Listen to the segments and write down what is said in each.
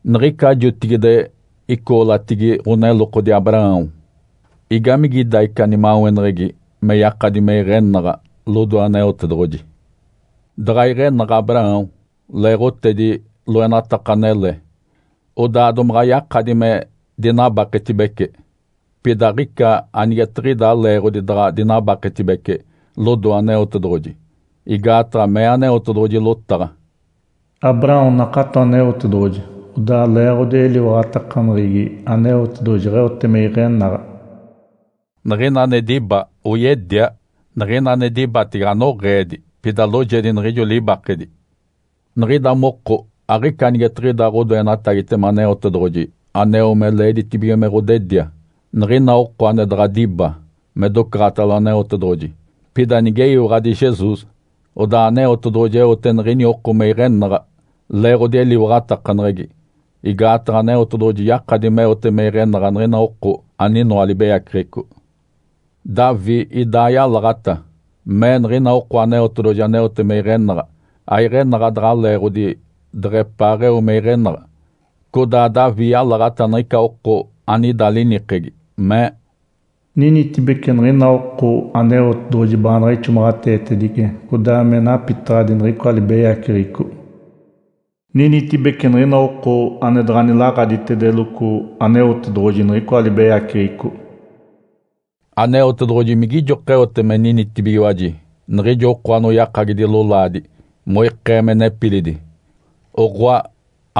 Niɡ̶ica jotigide icoolatigi ɡ̶onelokodi Abraão, igamigida ica nimaweneɡ̶egi me yakadi me iɡ̶enaɡ̶a lodoe Aneotedoɡ̶oji? Daɡ̶a iɡ̶enaɡ̶a Abraão leeɡ̶otedi loenataka anele, odaa domaɡ̶a yakadi me dinabaketibece. Pida aɡ̶ica anigetiɡ̶ida leeɡ̶odi daɡ̶a dinabaketibece lodoe Aneotedoɡ̶oji. Igaataɡ̶a mee Aneotedoɡ̶oji lotaɡ̶a, “Abraão nakato Aneotedoɡ̶oji, odaa leeɡ̶odi eliwaɡ̶atakaneɡ̶egi Aneotedoɡ̶oji jeɡ̶eote me iɡ̶enaɡ̶a.” Niɡ̶ina ane diba, oyedia. Niɡ̶ina ane dibatege anoɡ̶eedi, pida loojedi niɡ̶ijo libakedi. (Niɡ̶ida moko aɡ̶ica anigetiɡ̶ida ɡ̶odoenatagitema Aneotedoɡ̶oji aneo me leeditibige me ɡ̶odedia.) Niɡ̶ina oko ane daɡ̶a diba me docaɡ̶atalo Aneotedoɡ̶oji, pida nigeyiwaɡ̶adi Jesus, odaa Aneotedoɡ̶oji eote niɡ̶ini oko me iɡ̶enaɡ̶a leeɡ̶odi eliwaɡ̶atakaneɡ̶egi. Igaataɡ̶a Aneotedoɡ̶oji yakadi meote me iɡ̶enaɡ̶a niɡ̶ina oko aninoa libeyaceɡ̶eco. Davi idaa yalaɡ̶ata. Mee niɡ̶ina oko Aneotedoɡ̶oji aneote me iɡ̶enaɡ̶a, aiɡ̶enaɡ̶a daɡ̶a leeɡ̶odi deɡ̶epaaɡ̶eo me iɡ̶enaɡ̶a. Codaa Davi yalaɡ̶ata niɡ̶ica oko anida linikegi, mee, “Ninitibece niɡ̶ina oko Aneotedoɡ̶oji baanaɡ̶a ixomaɡ̶ateetedice codaa me napitaɡ̶adi niɡ̶icoa libeyaceɡ̶eco. Ninitibece niɡ̶ina oko ane daɡ̶a nilaɡ̶aditedeloco Aneotedoɡ̶oji niɡ̶icoa libeyaceɡ̶eco.” Aneotedoɡ̶oji migijoka eote me ninitibigiwaji niɡ̶ijo oko anoyakagidi lolaadi moikee me nepilidi? Oɡ̶oa,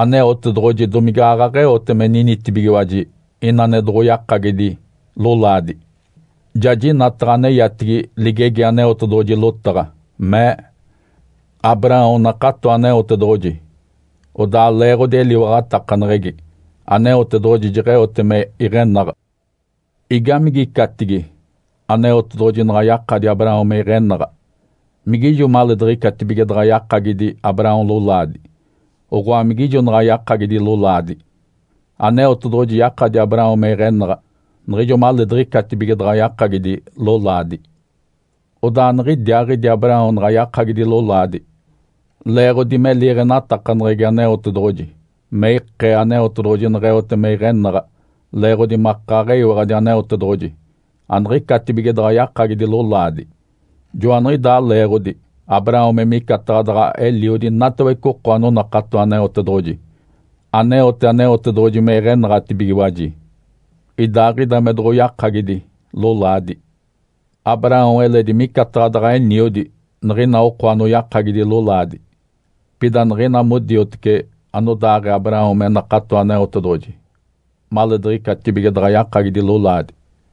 Aneotedoɡ̶oji domige aaɡ̶aɡ̶eote me ninitibigiwaji ina ane doɡ̶oyakagidi lolaadi? Ja jinataɡ̶a aneyatigi ligegi Aneotedoɡ̶oji lotaɡ̶a, mee, “Abraão nakato Aneotedoɡ̶oji, odaa leeɡ̶odi eliwaɡ̶atakaneɡ̶egi Aneotedoɡ̶oji jeɡ̶eote me iɡ̶enaɡ̶a.” Igamigicatigi Aneotedoɡ̶oji naɡ̶a yakadi Abraão me iɡ̶enaɡ̶a? Migijo maleediɡ̶icatibige daɡ̶a yakagidi Abraão lolaadi, oɡ̶oa, migijo naɡ̶a yakagidi lolaadi? Aneotedoɡ̶oji yakadi Abraão me iɡ̶enaɡ̶a niɡ̶ijo maleediɡ̶icatibige daɡ̶a yakagidi lolaadi. Odaa niɡ̶idiaaɡ̶idi Abraão naɡ̶a yakagidi lolaadi leeɡ̶odi me liiɡ̶enatakaneɡ̶egi Aneotedoɡ̶oji me ikee Aneotedoɡ̶oji neɡ̶eote me iɡ̶enaɡ̶a leeɡ̶odi makaaɡ̶eyiwaɡ̶adi Aneotedoɡ̶oji aniɡ̶icatibige daɡ̶a yakagidi lolaadi. Joaniɡ̶idaa leeɡ̶odi Abraão me micataɡ̶a daɡ̶a eliodi inatawece oko anonakato Aneotedoɡ̶oji, aneote Aneotedoɡ̶oji me iɡ̶enaɡ̶atibigiwaji, idaaɡ̶ida me doɡ̶oyakagidi lolaadi. Abraão eledi micataɡ̶a daɡ̶a eniodi niɡ̶ina oko anoyakagidi lolaadi, pida niɡ̶ina modioteci anodaaɡ̶ee Abraão me nakato Aneotedoɡ̶oji maleediɡ̶icatibige daɡ̶a yakagidi lolaadi.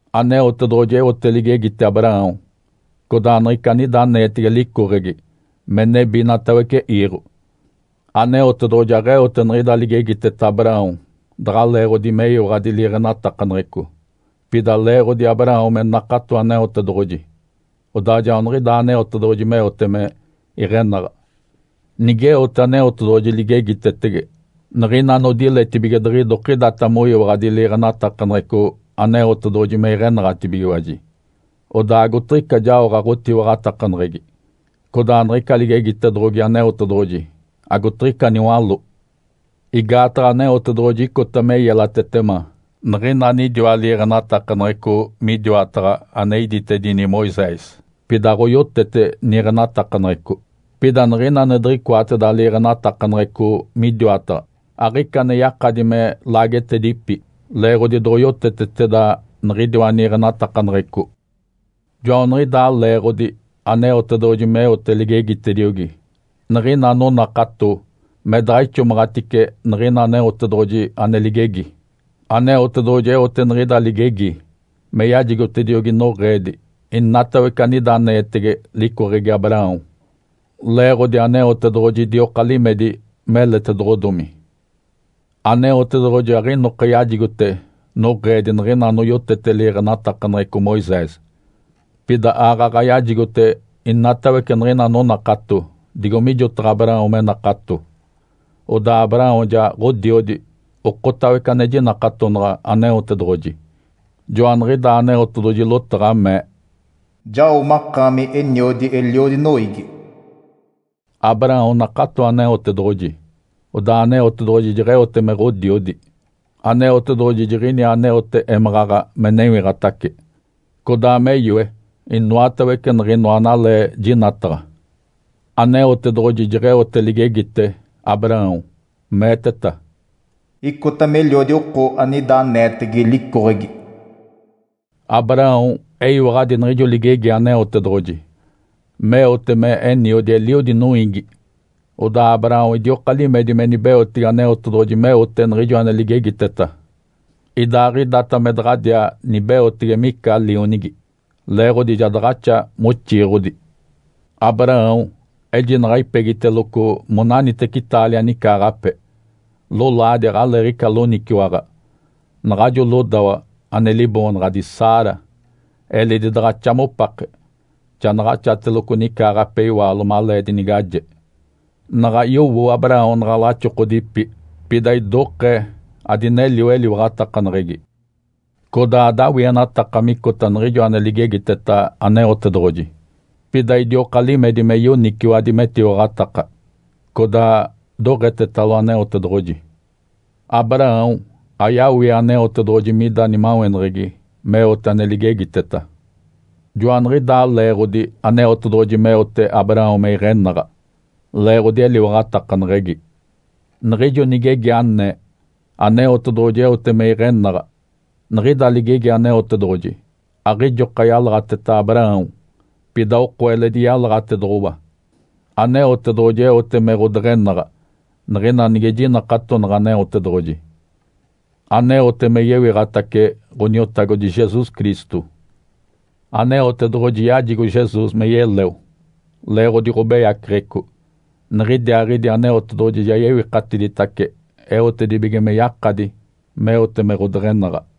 Aneotedoɡ̶oji eote ligegite Abraão codaa niɡ̶ica anida aneetege licoɡ̶egi me nebi inatawece iiɡ̶o. Aneotedoɡ̶oji aɡ̶eote niɡ̶ida ligegiteta Abraão daɡ̶a leeɡ̶odi meyiwaɡ̶adi liiɡ̶enatakaneɡ̶eco, pida leeɡ̶odi Abraão me nakato Aneotedoɡ̶oji. Odaa joaniɡ̶idaa Aneotedoɡ̶oji meote me iɡ̶enaɡ̶a. Nigeote Aneotedoɡ̶oji ligegitetege niɡ̶ina anodiletibige diɡ̶idokidata moyiwaɡ̶adi liiɡ̶enatakaneɡ̶eco Aneotedoɡ̶oji me iɡ̶enaɡ̶atibigiwaji, odaa agotiɡ̶ica jaoɡ̶a ɡ̶otiwaɡ̶atakaneɡ̶egi. Codaa niɡ̶ica ligegitedoɡ̶ogi Aneotedoɡ̶oji agotiɡ̶ica niwaló. Igaataɡ̶a Aneotedoɡ̶oji icota me yelatetema niɡ̶ina anidiwa liiɡ̶enatakaneɡ̶eco midiwataɡ̶a ane iditedini Moisés, pida aɡ̶oyotete niiɡ̶enatakaneɡ̶eco. Pida niɡ̶ina ane diɡ̶icoateda liiɡ̶enatakaneɡ̶eco midiwataɡ̶a, aɡ̶ica ane yakadi me laagetedipi leeɡ̶odi doɡ̶oyoteteteda niɡ̶idiwa niiɡ̶enatakaneɡ̶eco. Joaniɡ̶idaa leeɡ̶odi Aneotedoɡ̶oji meote ligegitediogi niɡ̶ina anonakato me daɡ̶a ixomaɡ̶atice niɡ̶ina Aneotedoɡ̶oji ane ligegi. Aneotedoɡ̶oji eote niɡ̶ida ligegi me yajigotediogi noɡ̶eedi inatawece anida aneetege licoɡ̶egi Abraão leeɡ̶odi Aneotedoɡ̶oji idioka limedi meletedoɡ̶odomi. Aneotedoɡ̶oji aɡ̶inoka yajigote noɡ̶eedi niɡ̶ina anoyotete liiɡ̶enatakaneɡ̶eco Moisés, pida aaɡ̶aɡ̶a yajigote inatawece niɡ̶ina anonakato digo mijotaɡ̶a Abraão me nakato. Odaa Abraão ja ɡ̶odiodi okotawece ane jinakatonaɡ̶a Aneotedoɡ̶oji. Joaniɡ̶idaa Aneotedoɡ̶oji lotaɡ̶a mee, “Jao makaami eniodi eliodi noiigi.” Abraão nakato Aneotedoɡ̶oji, odaa Aneotedoɡ̶oji jeɡ̶eote me ɡ̶odiodi. Aneotedoɡ̶oji jiɡ̶iniaa aneote émaɡ̶aɡ̶a me newiɡ̶atace, codaa me yoe inoatawece niɡ̶inoa analee jinataɡ̶a. Aneotedoɡ̶oji jeɡ̶eote ligegite Abraão, meeteta, “Icota meliodi oko anida aneetege licoɡ̶egi.” Abraão eyiwaɡ̶adi niɡ̶ijo ligegi Aneotedoɡ̶oji meote me eniodi eliodi noiigi. Odaa Abraão idioka limedi me nibeotege Aneotedoɡ̶oji meote niɡ̶ijo ane ligegiteta, idaaɡ̶idata me daɡ̶adiaa nibeotege mica lionigi, leeɡ̶odi ja daɡ̶axa moxiiɡ̶odi. Abraão ejinaɡ̶a ipegiteloco monaniteci taalia nicaaɡ̶ape. Lolaadi aɡ̶aleeɡ̶ica loniciwaɡ̶a. Naɡ̶ajo lodawa ane liboonaɡ̶adi Sara eledi daɡ̶axa mopake, ja naɡ̶axatelogo nicaaɡ̶ape iwaalo malee dinigaje. Naɡ̶a yowo Abraão naɡ̶a laxokodipi, pida idokee adinelio eliwaɡ̶atakaneɡ̶egi. Codaa adawienataka micota niɡ̶ijo ane ligegiteta Aneotedoɡ̶oji. Pida idioka limedi me yoniciwadi metiwaɡ̶ataka, codaa doɡ̶etetalo Aneotedoɡ̶oji. Abraão ayawie Aneotedoɡ̶oji mida nimaweneɡ̶egi meote ane ligegiteta. Joaniɡ̶idaa leeɡ̶odi Aneotedoɡ̶oji meote Abraão me iɡ̶enaɡ̶a, leeɡ̶odi eliwaɡ̶atakaneɡ̶egi. Niɡ̶ijo nigegi anee, “Aneotedoɡ̶oji eote me iɡ̶enaɡ̶a.” Niɡ̶ida ligegi Aneotedoɡ̶oji aɡ̶ijoka yalaɡ̶ateta Abraão, pida oko eledi yalaɡ̶atedoɡ̶owa. Aneotedoɡ̶oji eote me ɡ̶odeɡ̶enaɡ̶a, niɡ̶ina nige jinakatonaɡ̶a Aneotedoɡ̶oji, aneote me yewiɡ̶atace Ǥoniotagodi Jesus Cristo. Aneotedoɡ̶oji yajigo Jesus me yeleo leeɡ̶odi ɡ̶obeyaceɡ̶eco. Niɡ̶idiaaɡ̶idi Aneotedoɡ̶oji ja yewikatiditace eotedibige me yakadi meote me ɡ̶odeɡ̶enaɡ̶a.